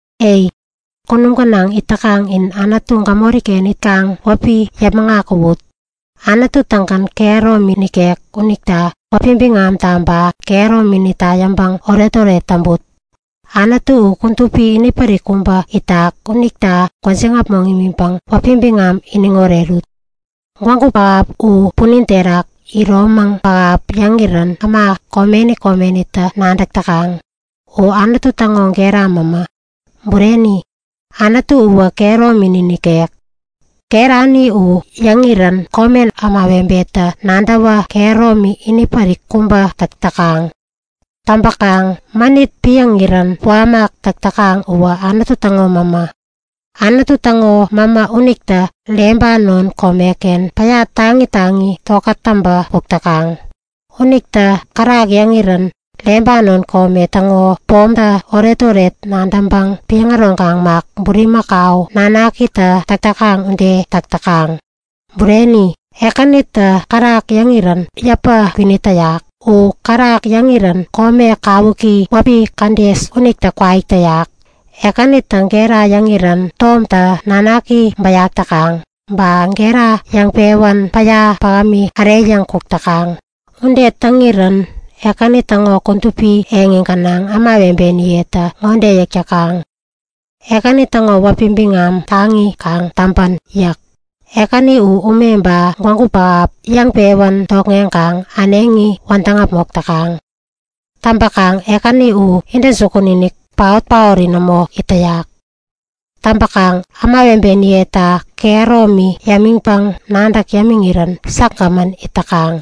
Ei! Kunum gänaŋ it täkaŋ in Anutu gämoriken itkaŋ wäpi yäpmäŋ akuwut! Anutu-tägän kehäromi nikek unita wäpi biŋamta ba kehärominita yäŋpäŋ oretoret täŋput. Anutu u kudupi inipärik kubä itak unita gwäjiŋ äpmoŋ imiŋpäŋ wäpi biŋam iniŋ orerut! Gwägu pähap u punin terak iromäŋ pähap yäŋirän äma komeni komenitä nadäk täkaŋ. U Anutu täŋo gera mämä. Bureni! Anutu uwä kehäromini nikek. Gerani u yäŋirän komen ämawebetä nadäwä kehäromi ini pärik kubä täk täkaŋ. Täŋpäkaŋ mänit piäŋirän puamäk täk täkaŋ uwä Anutu täŋo mämä. Anutu täŋo mämä unitä Lebanon komeken päya taŋi taŋi tokät täŋpä kuk täkaŋ. Unitä kärak yäŋirän Lebanon kome täŋo pomtä oretoret nadäŋpäŋ piäŋ äroŋkaŋ mak, bulimakau nanakitä täk täkaŋ ude täk täkaŋ. Bureni, Ekänitä kärak yäŋirän yäpä kwinit täyak. U kärak yäŋirän kome kawuki wäpi Kades unitä kwaik täyak. Ekänitä gera yäŋirän tomtä nanaki bäyak täkaŋ. Ba gera yäŋpewän päya pähämi äreyäŋ kuk täkaŋ. Ude täŋirän Ekäni täŋo kudupi yot gänaŋ ämawebeniyetä ŋode yäk täkaŋ; Ekäni täŋo wäpi biŋam taŋi kaŋ täŋpän! yäk. Ekäni u ume ba gwägu pähap yäŋpewän tokŋeŋkaŋ äneŋi wädäŋ äpmok täkaŋ. Täŋpäkaŋ Ekäni u intäjukun-inik, paot-paori nämo it täyak. Täŋkaŋ ämawebeniyeta kehäromi yämiŋpäŋ nadäŋ yämiŋirän säkgämän it täkaŋ.